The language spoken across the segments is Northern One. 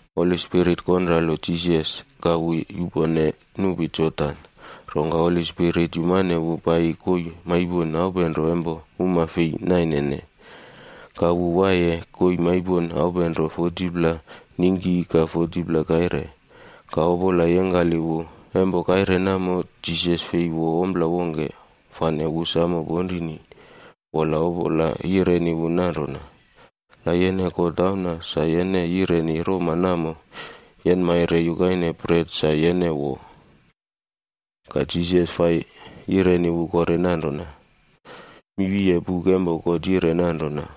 Holi Spirit konralo Jisas, ka wu yupone nupi Jodan, rongka Holi Spirit yumane wu paiyi koii maipon aupenro empo uma fei nainene. Ka wu waiye koii maipon aupenro 40pla ningki ka 40pla kaire, ka Opola yengkali wu. Empo kaire namo, Jisas fei wo ompla wongke, fane wu ponrini wamo. Wola Opola yireni wu nanrona, “La yene God Auna, sa yene yireni roma namo yenmaire yukaine bret sa yene wo.” Ka Jisas fai yireni wu kore nanrona, “Mi wiye buk empo God yire nanrona,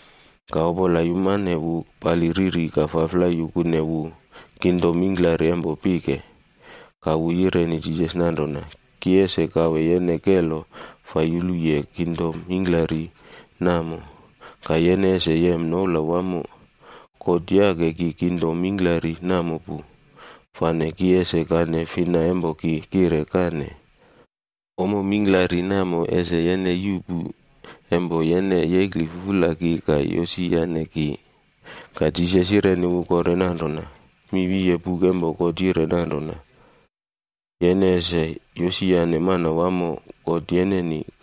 Ka Opola yumane wu pali riri ka faflai yukune wu kingdom mingklari empo pike. Ka wu yireni Jisas nanrona, “Ki ese kawe yene kelo fai yuluye kingdom mingklari namo, ka yene ese yem noula wamo. God yake ki kingdom mingklari namo pu, fane ki ese kane fina empo ki kire kane. Ommo mingklari namo ese yene yuꞌpu, empo yene yekli fufula ki ka yosiyane ki.” Ka Jisas yireni wu kore nanrona, “Mi wiye buk empo God yire nanrona, ‘Yene ese yosiyane Manawamo, God yeneni,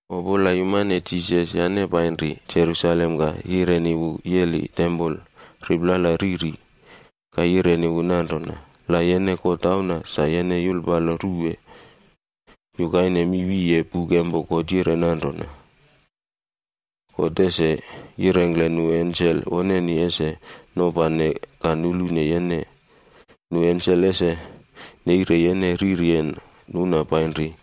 Opola yumane Jisas yane painri Jerusalem ka yirane wu yeli tempol riplala riri, ka yireni wu nanrona, “La yene God Auna, sa yene yulpalo ruwe. Yukaine mi wiye buk empo God yire nanrona, ‘God ese yirengkle nu ensel woneni ese nopane ka nulune yene. Nu ensel ese neire yene riryen nuna painri,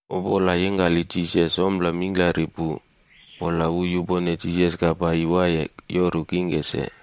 Opola yengkali Jisas ompla mingklari pu, wola wu yupone Jisas ka paiyi waiye yoru taim wongke se.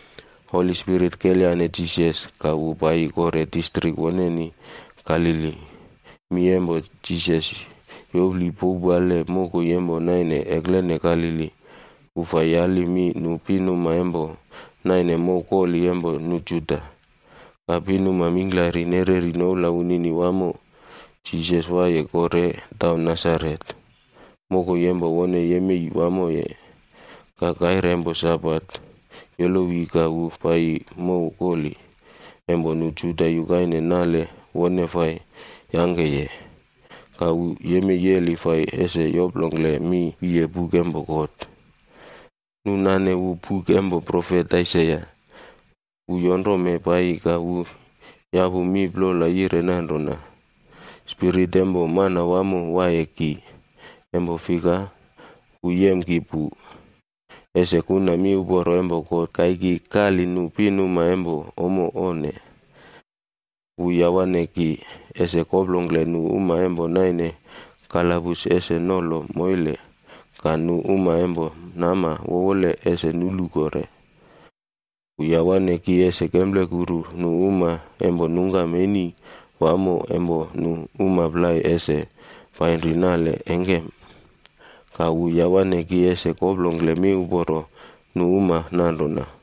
Holi Spirit kelyane Jisas, ka wu paiyi kore distrik woneni Galili. Mi empo Jisas yopli powpale mokoi empo naine eklene Galili. Wu fai yali mi nu pinuma empo naine mow koli empo nu Juda, ka pinuma mingklari nereri noula wunini wamo. Jisas paiyi kore taun Nasaret, mokoi empo wone yemei wamoye. Ka kaire empo Sabate yolowi ka wu paiyi mow kolif empo nu Juda yukaine nale wone fai yangkeye. Ka wu yemei yeli fai ese yoplongkle mi wiye buk empo God. Nu nane wu buk empo profet Aisaia. Wu yonrome paiyi ka wu yapu mi plola yire nanrona: “Spirit empo Manawamo waiye ki, empo fika, wu yem ki pu, ese kuna miuporo empo God kaiki kali nu pinuma empo ommo onne. Wu yawane ki, ese koplongkle nu uma empo naine kalabus ese nolo moile, ka nu uma empo nama wowole ese nulu kore. Wu yawane ki ese kemplekuru nu uma empo nungkam eni wamo empo nu uma plai ese painri nale engkem. Ka wu yawane ki ese koplongkle miuporo nu uma nanrona,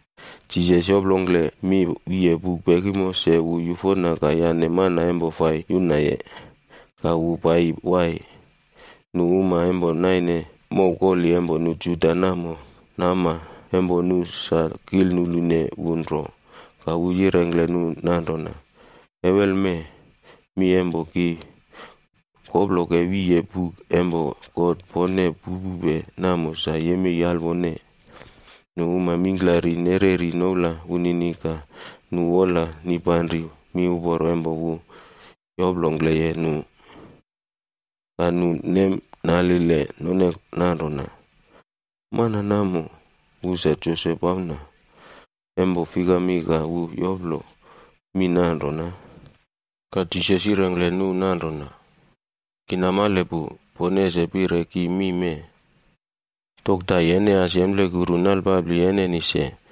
Jisas yoplongkle mi wiye buk pekimo, se wu yufona ka yane mana fai yunaye, ka wu paiyi wai.h Nu uma empo naine mow koli empo nu Juda namo, nama empo nu sa kilnulune wu nro. Ka wu yirengkle nu nanrona, “Ewelme, mi empo ki koploke wiye buk empo God pone pupupe namo sa yemei alwone.” Nu uma mingklari nereri noula wunini ka nu wola nipanri miuporo empo wu yoplongkleye nu. Ka nu nemnalile none nanrona, “Mana namo, wu sa Josep auna. Empo fikami ka wu yoplo mi nanrona?” Ka Jisas yirengkle nu nanrona, “Ki namale pu, pone ese pire ki mi mee, ‘Dokta, yene as yemplekuru nalpapli yeneni se.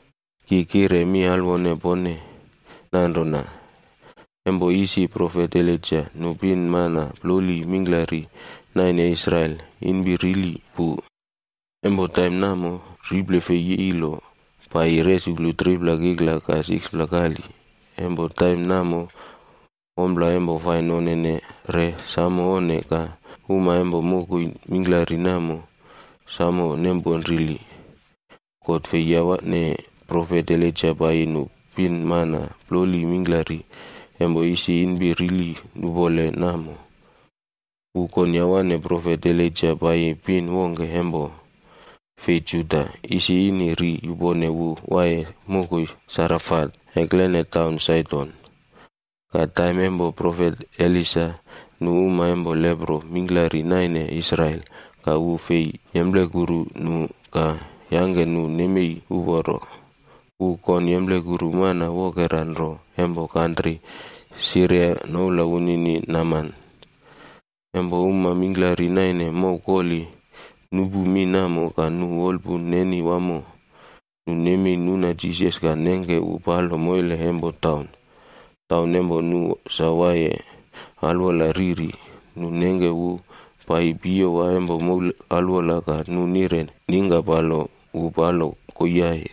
Ki kire mi alwone pone nanrona, empo isi profet Elaija, nu pinmana ploli mingklari naine Israel inpi rili pu. Empo taim namo, riple fei yilo paiyi resuklu 3pla kikla ka 6pla kali. Empo taim namo ompla empo fai nonene re samo onne ka uma empo mokoi mingklari namo samo nemponrili. God fei yawane profet Elaija paiyi nu pinmana ploli mingklari empo isi inpi rili nupole namo. Wu kon yawane profet Elaija paiyi pin wongke empo fei Juda, isi ini ri yupone wu waiye mokoi Sarefatj eklene biktaun Saidon. Ka taim empo profet Elisa, nu uma empo leprok mingklari naine Israel, ka wu fei yemplekuru nu ka yangke nu nemei uporo. Wu kon yemplekuru mana wokera nro empo kantri Siria noula wunini Naman fai yangke nale wunini namkile kore.” Empo uma mingklari naine mow koli nupu mi namo ka nu wolpun neni wamo. Nu nemei nuna Jisas ka nengke wu palo moile empo taun. Taun empo nu sa waiye alwola riri, nu nengke wu paiyi piyowa empo moul alwola ka nu nire ningkapalo wu palo koiiai.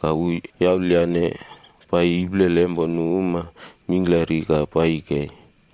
Ka wu yaulyane paiyi iplele empo nu uma mingklari ka paiyi kei.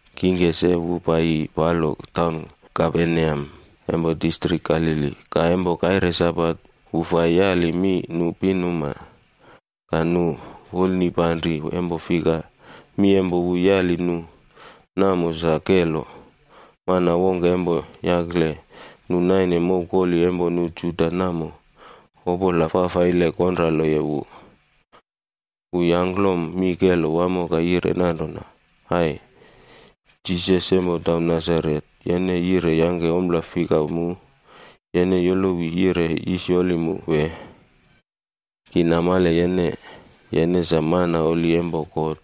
Kingke se wu paiyi palo taun Kaperneam empo distrik Galili, ka empo kaire Sabat wu fai yali mi nu pinuma. Ka nu wolnipanri empo fika, mi empo wu yali nu namo sa kelo. Mana wongke empo yakle nu naine mow koli empo nu Juda namo, opola fafaile konraloye wu. Wu yangklom mi kelo wamo ka yire nanrona, “Ai! Jisas empo taun Nasaret, yene yire yangke ompla fika mu? Yene yolowi yire yisyoli mu, wee? Ki namale yene, yene sa Mana Holi empo God.”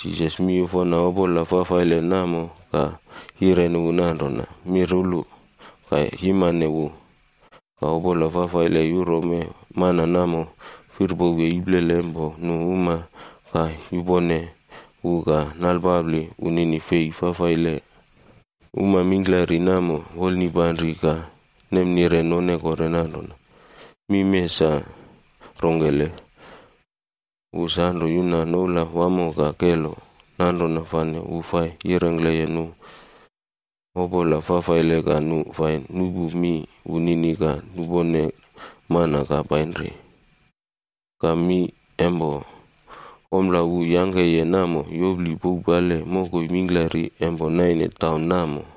Jisas miyufona opola fafaile namo ka yireni wu nanrona, “Mirulu! Ka yimane wu!” Ka opola fafaile yurome mana namo firpowe iplele empo nu uma ka yupone wu ka nalpapli wunini fei fafaile. Uma mingklari namo wolnipanri ka nemnire none kore nanrona, “Mi mee sa rongkele? Wu sanro yuna noula wamo ka kelo, nanrona fane wu fai yirengkleye nu opola fafaile ka nu fai nupu mi wunini ka nupone mana ka painri.” Ka mi empo ompla wu yangkeye namo yopli powpale mokoi mingklari empo naine taun namo.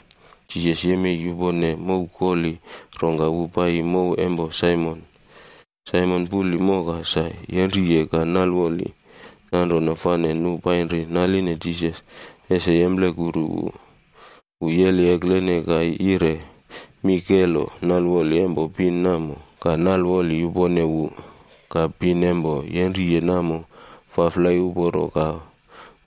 Jisas yemei yupone mow koli, rongka wu paiyi mow empo Saimon. Saimon puli moka sa yenriye ka nalwoli wamo. Nanrona fane nu painri naline Jisas ese yemplekuru wu. Wu yeli eklene ka yire mi kelo nalwoli empo pin namo, ka nalwoli yupone wu. Ka pin empo yenriye namo faflai uporo ka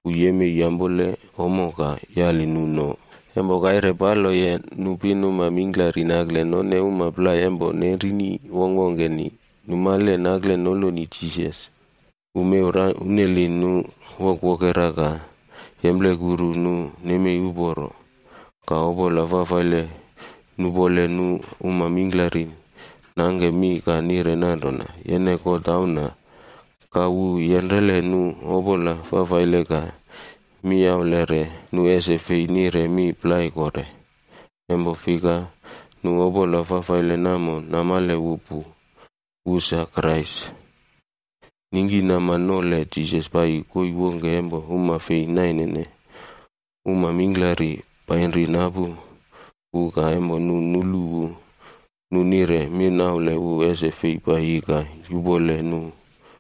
wu yemei yampole ommo ka yali nu no. Empo kaire paloye, nu pinuma mingklari nakle none uma plai empo nenrini wongkwongkeni, numale nakle noloni Jisas. Wu mew rauneli nu wokerwokera ka yemplekuru nu nemei uporo. Ka opola fafaile nupole nu uma mingklari nangke mi ka nire nanrona, “Yene God Auna.” Ka wu yenrele nu opola fafaile ka miyaulere nu ese fei nire mi plai kore. Empo fika nu opola fafaile namo namale wu pu, wu sa Krais. Ningkinama nole Jisas paiyi koii wongke empo uma fei nainene. Uma mingklari painri napu wu ka empo nu nulu wu, nu nire minaule wu ese fei paiyi ka yupole nu.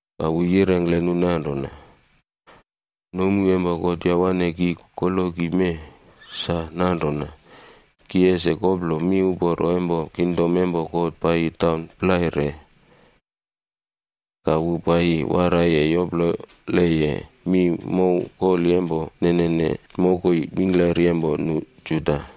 Ka wu yirengkle nu nanrona, “Nomu empo God yawane ki koloki mee, sa nanrona ki ese koplo miuporo empo kingdom empo God paiyi taun plai re.” Ka wu paiyi waraiye yoploleye mi mow koli empo nenene mokoi mingklari empo nu Juda.